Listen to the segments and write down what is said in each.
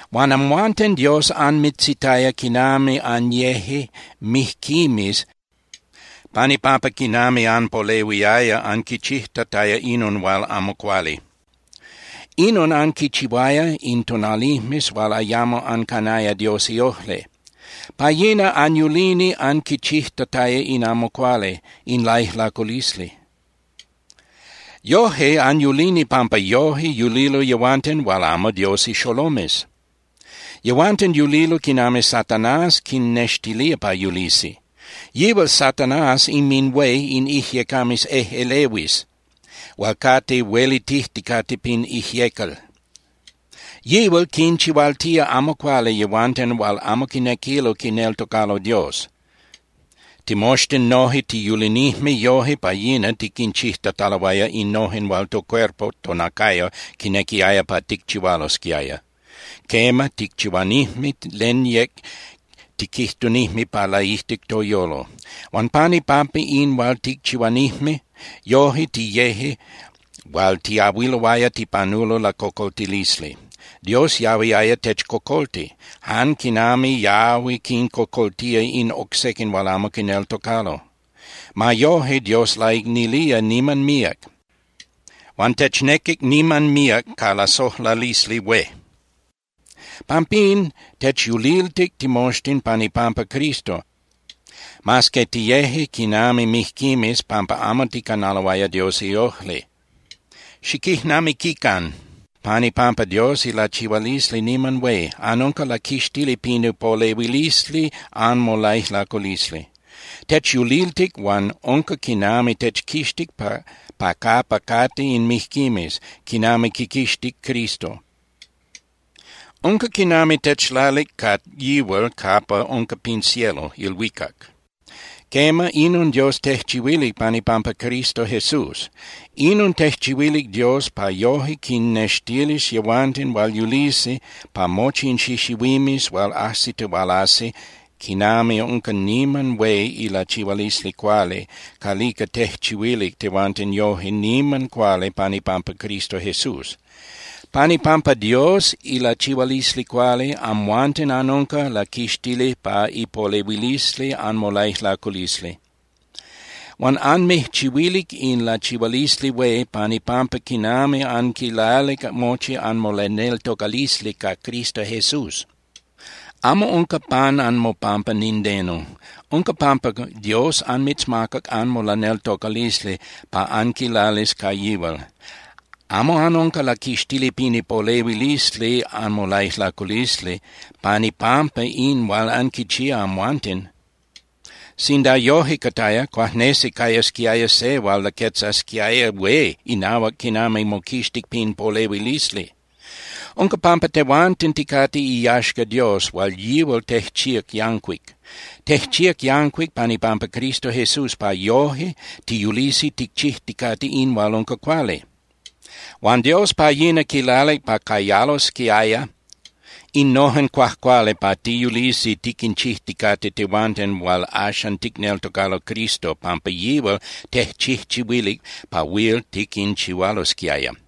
Huan amhuanten Dios anmitzitaya quinami anyeje mijquimes pan ipampa quinami anpolehuiaya anquichijtataya inon hual amo cuali. Inon anquichihuaya in tonalijmes hual ayamo ancanaya Dios iojli. Pa yina anyulini anquichijtataya in amo cuali, in laijlaculisli. Yoje anyulini pampa yoje yulilo yehuanten hual amo Dios ixolomes. Yehuanten yulilo quinami Satanás quinnextilía pa yulisi. Yihual Satanás inminhué in ijyecames ejꞌelehuis hual cate huelitijticate pin ijyecal. Yihual quinchihualtía amo cuali yehuanten hual amo quinequilo quineltocalo Dios. Timoxtin noje tiyulinijme yoje pa yina tiquinchijtataloaya innojen hual tocuerpo (tonacayo) quinequiaya pa ticchihualosquiaya. Quema, ticchihuanijme len yec tiquijtunijme pa laijtic toyolo. Huan pan ipampa in hual ticchihuanijme, yoje tiyeje hual tiahuiloaya tipanulo lacocoltilisli. Dios yahuiaya techcocolti, jan quinami yahui quincocoltía in oc sequin hual amo quineltocalo. Ma yoje, Dios laicnilía niman míac, huan technequic niman míac ca lasojlalisli hué. Pampín, techyuliltic timoxtin pan ipampa Cristo, mas que tiyeje quinami mijquimes pampa amo ticanaloaya Dios iojli. ¡Xiquijnamiquican, pan ipampa Dios ilachihualisli niman hué, anunca laquixtili pin ipolehuilisli anmolaijlaculisli! Techyuliltic huan unca quinami techquixtic pa capa cate in mijquimes, quinami quiquixtic Cristo. Unca quinami techlalic ca yihual capa unca pin cielo (ilhuicac). Quema, inon Dios tejchihuilic pan ipampa Cristo Jesús. Inon tejchihuilic Dios pa yoje quinnextilis yehuanten hual yulisi pa mochi in xixihuimes hual ajsitihualasi quinami unca niman hué ilachihualisli cuali calica tejchihuilic tehuanten yoje niman cuali pan ipampa Cristo Jesús. Pan ipampa Dios ilachihualisli cuali, amhuanten anunca laquixtili pa ipolehuilisli anmolaijlaculisli. Huan anmijchihuilic in lachihualisli hué pan ipampa quinami anquilalic mochi anmolaneltocalisli ca Cristo Jesús. Amo unca pan anmopampa nindeno. Unca pampa Dios anmitzmacac anmolaneltocalisli pa anquilalis ca yihual. Amo anunca laquixtili pin ipolehuilisli anmolaijlaculisli pan ipampa in hual anquichía amhuanten. Sinda yoje cataya, cuajnesi cayasquiaya se hual laquetzasquiaya hué inahuac quinami moquixtic pin polehuilisli. Unca pampa tehuanten ticate iyaxca Dios hual yihual tejchíac yancuic. Tejchíac yancuic pan ipampa Cristo Jesús pa yoje tiyulisi ticchijticate in hual unca cuali. Huan Dios pa yina quilalic pa cayalosquiaya innojen cuajcuali pa tiyulisi tiquinchijticate tehuanten hual axan ticneltocalo Cristo, pampa yihual tejchijchihuilic pa huil tiquinchihualosquiaya.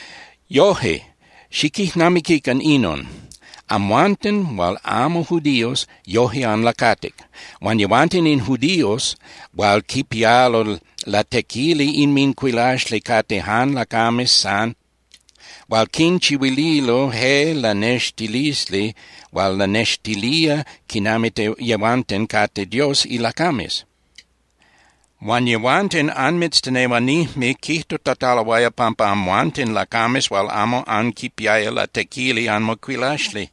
Yoje, xiquijnamiquican inon. Amhuanten hual amo judíos, yoje anlacatic. Huan yehuanten in judíos hual quipialo latequili inmincuilaxli cate jan lacames san hual quinchihuililo je lanextilisli hual lanextilía quinami yehuanten cate Dios ilacames. Huan yehuanten anmitztenehuanijme quijtutataloaya pampa amhuanten lacames hual amo anquipiaya latequili anmocuilaxli,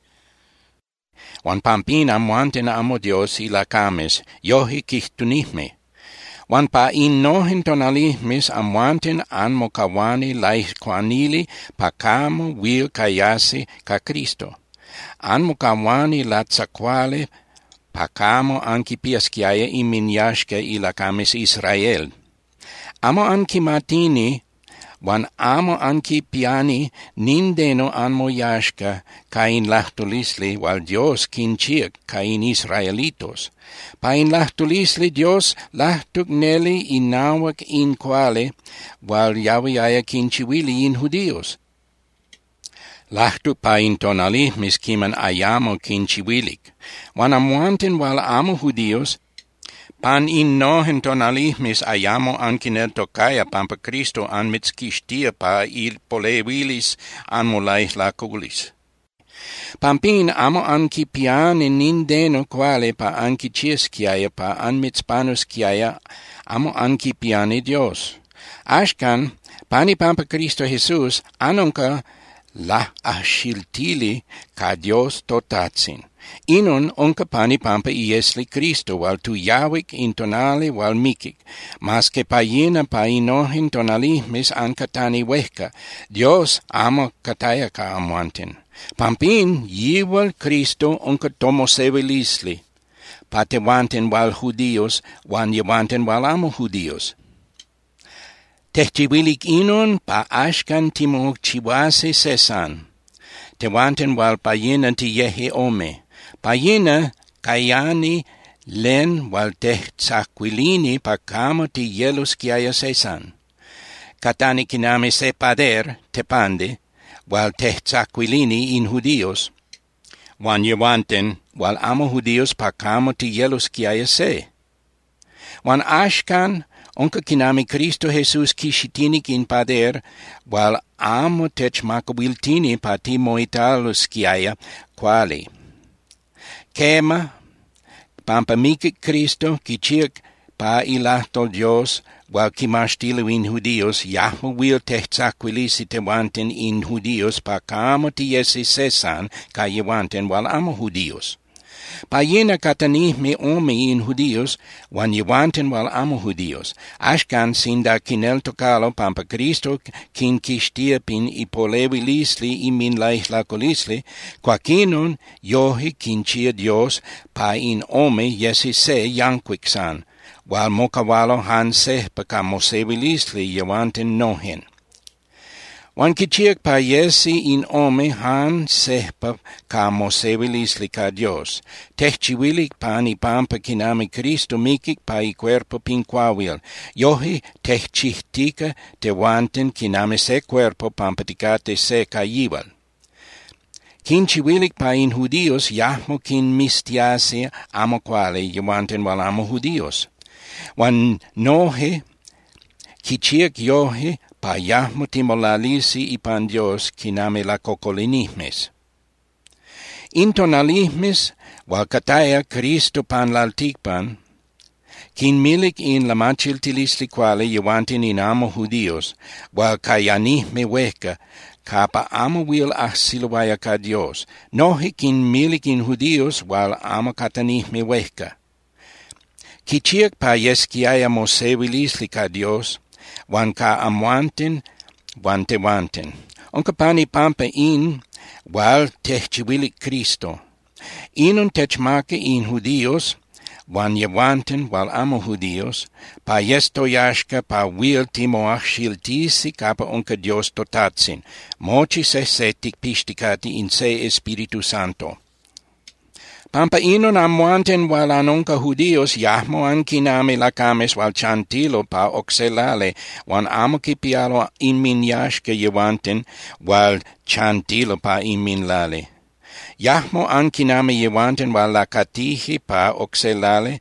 huan pampín amhuanten amo Dios ilacames, yoje quijtunijme. Huan pa innojen tonalijmes, amhuanten anmocahuani laijcuanili pa camo huil cayasi ca Cristo. Anmocahuani latzacuali pa camo anquipiasquiaya inminyaxca ilacames Israel. Amo anquimatini huan amo anquipiani nindeno anmoyaxca ca in lajtulisli hual Dios quinchíac ca in israelitos. Pa in lajtulisli Dios lajtuc neli inahuac in cuali hual yahuiaya quinchihuili in judíos, lajtuc pa in tonalijmes quiman ayamo quinchihuilic. Huan amhuanten hual amo judíos, pan innojen tonalijmes ayamo anquineltocaya pampa Cristo anmitzquixtía pa ipolehuilisli anmolaijlaculisli. Pampín amo anquipiani nindeno cuali pa anquichiasquiaya pa anmitzpanusquiaya, amo anquipiani Dios. Axcan pan ipampa Cristo Jesús, anunca laꞌajxiltili ca Dios toTajtzin. Inon unca pan ipampa iesli Cristo hual tuyahuic in tonali hual miquic, mas que pa yina pa innojen tonalijmes ancatani huejca, Dios amo cataya ca amhuanten. Pampín, yihual Cristo unca tomosehuilisli pa tehuanten hual judíos huan yehuanten hual amo judíos. Tejchihuilic inon pa axcan timochihuasi se san, tehuanten hual pa yina tiyeje ome. Pa yina cayani len hual tejtzacuilini pa camo tiyelosquiaya se san. Catani quinami se pader (tepandi) hual tejtzacuilini in judíos huan yehuanten hual amo judíos pa camo tiyelosquiaya se. Huan axcan, unca quinami Cristo Jesús quixitinic in pader hual amo techmacahuiltini pa timoitalosquiaya cuali. Quema, pampa miquic Cristo, quichíac pa ilajtol Dios hual quimaxtilo in judíos yajmo huil tejtzacuilisi tehuanten in judíos pa camo tiyesi se san ca yehuanten hual amo judíos. Pa yina catanijme ome in judíos huan yehuanten hual amo judíos. Axcan, sinda quineltocalo pampa Cristo quinquixtía pin ipolehuilisli inminlaijlaculisli, cuaquinon yoje quinchía Dios pa in ome yesi se yancuic san hual mocahualo jan sejpa ca mosehuilisli yehuanten nojen. Huan quichíac pa yesi in ome jan sejpa ca mosehuilisli ca Dios. Tejchihuilic pan ipampa quinami Cristo miquic pa icuerpo pin cuahuil, yoje tejchijtica tehuanten quinami se cuerpo pampa ticate se ca yihual. Quinchihuilic pa in judíos yajmo quinmiztiasi amo cuali yehuanten hual amo judíos. Huan noje quichíac yoje pa yajmo timolalisi ipan Dios quinami lacocolinijmes. In tonalijmes hual cataya Cristo pan lalticpan, quinmilic in lamachiltilisli cuali yehuanten in amo judíos hual cayanijme huejca capa amo huil ajsiloaya ca Dios, noje quinmilic in judíos hual amo catanijme huejca. Quichíac pa yesquiaya mosehuilisli ca Dios huan ca amhuanten huan tehuanten. Unca pan ipampa in hual tejchihuilic Cristo. Inon techmaca in judíos huan yehuanten hual amo judíos pa yes toyaxca pa huil timoajxiltisi capa unca Dios toTajtzin, mochi sejse ticpixticate in se Espíritu Santo. Pampa inon, amhuanten hual anunca judíos yajmo anquinami lacames hual chantilo pa oc se lali huan amo quipialo inminyaxca yehuanten hual chantilo pa inminlali. Yajmo anquinami yehuanten hual lacatije pa oc se lali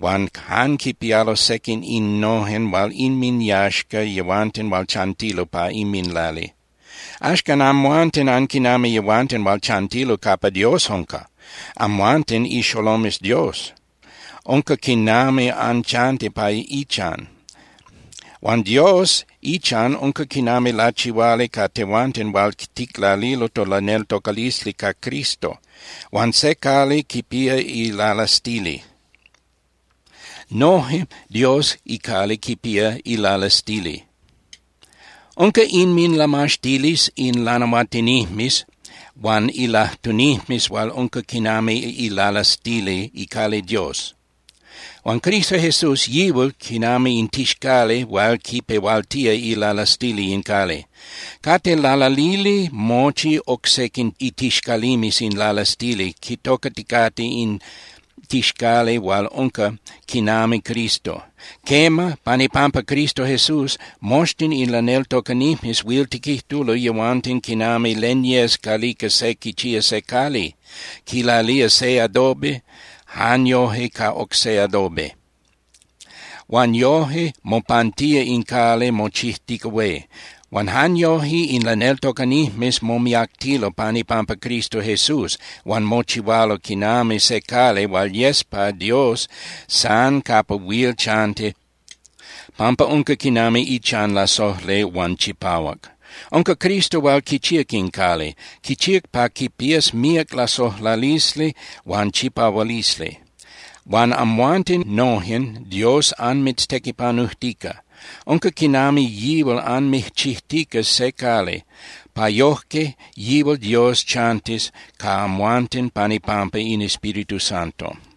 huan jan quipialo sequin innojen hual inminyaxca yehuanten hual chantilo pa inminlali. Axcan amhuanten anquinami yehuanten hual chantilo capa Dios unca, amhuanten ixolomes Dios, unca quinami anchanti pa ichan. Huan Dios ichan unca quinami lachihuali ca tehuanten hual ticlalilo tolaneltocalisli ca Cristo. Huan se cali quipía ilalastili. Noje Dios icali quipía ilalastili. Unca inminlamaxtilisli in lanahuatinijmes huan ilajtunijmes hual unca quinami ilalastili icali Dios. Huan Cristo Jesús, yihual quinami in tixcali hual quipehualtía ilalastili in cali. Cate lalalili mochi oc sequin itixcalimes in lalastili quitocaticate in tixcali hual unca quinami Cristo. Quema, pan ipampa Cristo Jesús, moxtin in laneltocanijmes huil tiquijtulo yehuanten quinami len yes calica se quichía se cali, quilalía se adobe jan yoje ca oc se adobe, huan yoje mopantía in cali, mochijtica hué. Huan jan yoje in laneltocanijmes momiactilo pan ipampa Cristo Jesús huan mochihualo quinami se cali hual yes pa Dios san capa huil chanti pampa unca quinami ichan lasojli huan chipahuac. Unca Cristo hual quichíac in cali. Quichíac pa quipías míac lasojlalisli huan chipahualisli. Huan amhuanten nojen Dios anmitztequipanujtica. Unca quinami yihual anmijchijtica se cali, pa yojque yihual Dios chantis ca amhuanten pan ipampa in Espíritu Santo.